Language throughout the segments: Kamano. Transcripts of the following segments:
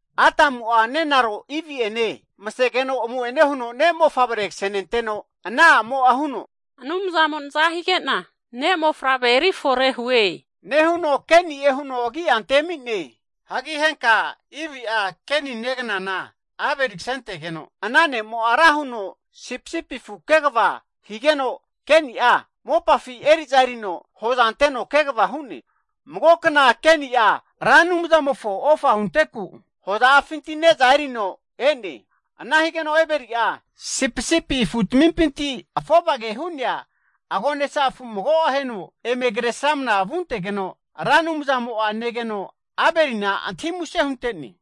Adamu'a nenaro Ivi'ene masegeno amu'ene huno ne'mofavre kasenenteno ana a'mo'a huno, Anumzamo naza hige'na ne'mofavre erifore hue, nehuno Keni'e huno agi'a antemi'ne. Hagi henka Ivi'a Keni neganana Abeli kasentegeno ana ne'mo'a ra huno sipisipi afu kegava higeno, Keni'a mopafi eri'za erino hoza anteno kegava hu'ne. Magokna Keni'a Ra Anumzamofo ofa hunteku hoza'afinti ne'za erino e'ne. Ana higeno Abeli'a sipisipi afutamimpinti afovage hu'nea agonesa afu mago aheno eme Kresramana vuntegeno, Ra Anumzamo'a negeno Abelina antahi muse hunte'ne.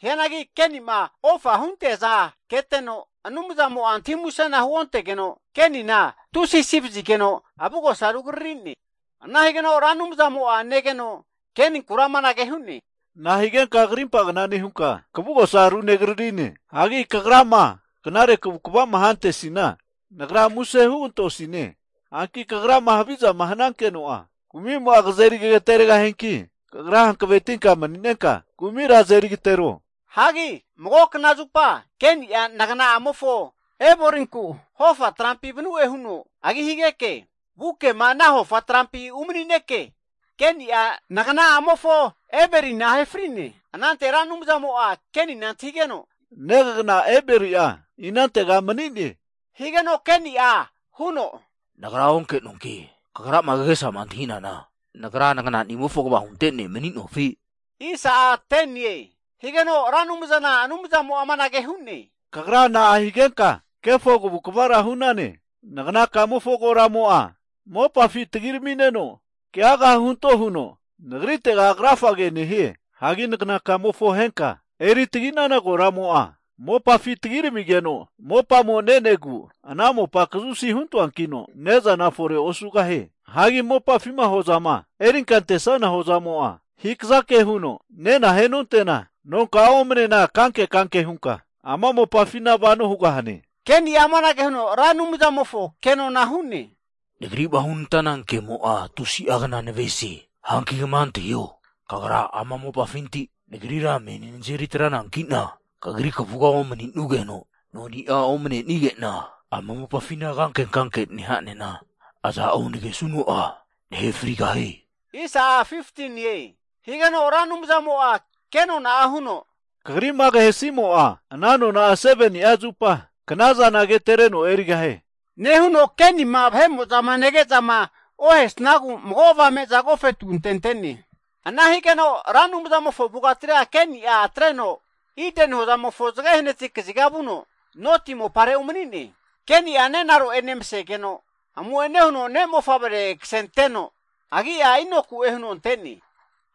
Hianagi Keni'ma ofa hunte'neaza keteno, Anumzamo'a antahi musena huontegeno, Kenina tusi asi vazigeno avugosa rugriri'ne. Ana higeno Ra Anumzamo'a negeno Keninkura amanage hu'ne, Nahigenka krimpagna nehunka kavugosa runegaririne? Hagi kagra'ma knare kavu'kava'ma hantesina Nagra muse hugantosine. Hanki kagrama havizama hanankeno'a, kumimo'a kazeri kagateregahianki, kagra hankavetinka mani'nenka kumira azeri agatero. Hagi mago knazupa Keni'a nagana'amofo Abelinku hofa trampi vanu'e huno agi higeke, vukema ana hofa trampi umanineke, Keni'a nagna'amofo Abelina ahe fri'ne. Anante Ra Anumzamo'a Kenina antahigeno, Negagna Abeli'a inantega mani'ne? Higeno Keni'a huno, Nagra onke'noanki, Kagrama kagesama antahinana nagra nagananimofo kva hunte ne' mani'nofi? Higeno Ra Anumzana Anumzamo'a amanage hu'ne, Kagra na'a higenka kefo kavukvara hu'nane? Nagnakamofo koramo'a mopafi tagiramineno keaga hunto huno Nagritega krafage nehie. Hagi nagna kamofoma ahenka eri taginana koramo'a, mopafi tagiramigeno mopamo ne'negu, ana mopa kazusi huntoankino ne'zana forera osugahie. Hagi mopafima hozama erinka antesnana hozamo'a, hikazake huno nena ahenonte'na, nonka'a omanena kanke kanke hunka ama mopafina vano hugahane. Keni'a amanage huno Ra Anumzamofo kenona hu'ne, Nagri'ma hunantana kemo'a tusi'a kna navesie! Hanki kama antahio! Kagra ama mopafinti nagrira meni nazeri atranankina, Kagri kavuga omaninugeno, noni'a omane'nenigena ama mopafina kanke kanke neha'nena, aza'o nagesuno'a nahe frigahie. Higeno Ra Anumzamo'a kenona'a huno, Kagri'ma kahesimo'a ana nona'a 7ni'a zupa kna'zana agetereno erigahie, nehuno Kenima vahe'mo'zama negezama ohesnagu mago avame'za agofetu antente'ne. Ana higeno Ra Anumzamofo avugatira Keni'a atreno Ideni hozamofo zage hanati kaziga vuno, Nodi mopare umani'ne. Keni'a nenaro'ene masegeno amu'ene huno ne'mofavre kasenteno, agi'a Inoku'e huno ante'ne.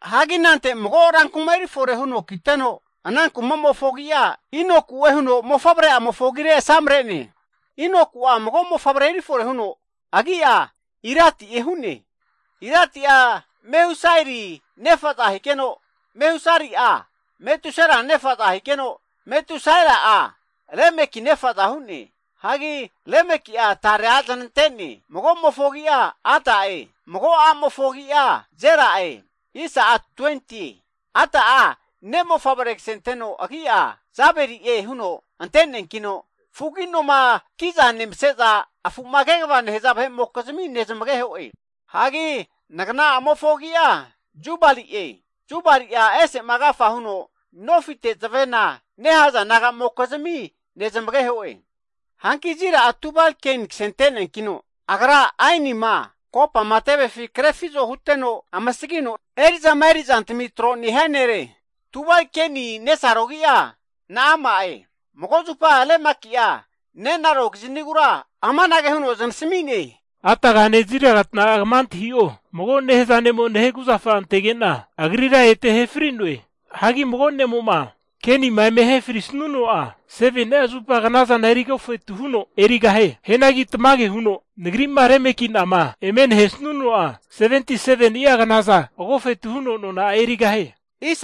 Hagi anante mago rankuma erifore huno kiteno, ana kumamofo agi'a Inoku'e huno mofavre'amofo agire asamre'ne. Hagi Inoku'a mago mofavre eri fore huno agi'a Iradi'e hu'ne. Iradi'a Mehusaeli nefa'za higeno, Mehusaeli'a Metusael nefa'za higeno, Metusaeli'a Lemeki nafa'za hu'ne. Hagi Lemeki'a tare atre zanante'ne, mago'mofo agi'a Ada'e, mago a'mofo agi'a Zila'e. Ada'a ne'mofavre kasenteno agi'a Jabali'e huno ante'neankino, fugagi noma ki'za nemase'za afu'ma kegava nehaza vahe'mokizmi nezamageho'e. Hagi ngana'amofo agi'a Jubali'e. Jubali'a ese'ma agafa huno nofite zavena (harp) nehaza naga'mokizmi nezamageho'e. Hanki Zila'a Tubalkein kasente'neankino, agra aenima, kopama tevefi krefizo huteno amasagino eri'zama eri'zantami tro nehia nere. Tubalkeini nesaro agi'a Na'ama'e. Mago zupa Lemeki'a nenaro kiznigura amanage huno zanasmi'ne, Adagane Zilagata'a kama antahi'o, mago nehaza ne'mo nahe kuzafa antege'na, agrira ete ahe fri'noe. Hagi mago ne'mo'ma, Kenima eme ahe frisanuno'a, 7ni'a zupa knazana eri agofetu huno erigahie. Hianagi tamage huno nagri'ma Lemeki'nama eme nahesanuno'a, 77ni'a knazana agofetu huno nona'a erigahie.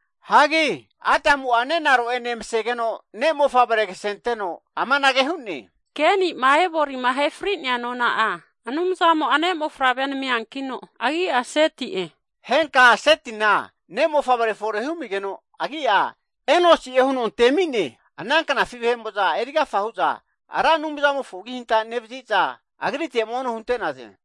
Hagi Adamu'a nenaro'ene masegeno ne' mofavre kasenteno amanage hu'ne, Keni'ma Abelima ahe fri'nea nona'a Anumzamo'a ne'mofavrea namiankino agi'a Seti'e. Henka'a Setina ne'mofavre fore humigeno agi'a Enosi'e huno antemi'ne. Ana knafi vahe'mo'za erigafa hu'za Ra Anumzamofo agihanta nevazi'za, Agrite mono hunte'naze.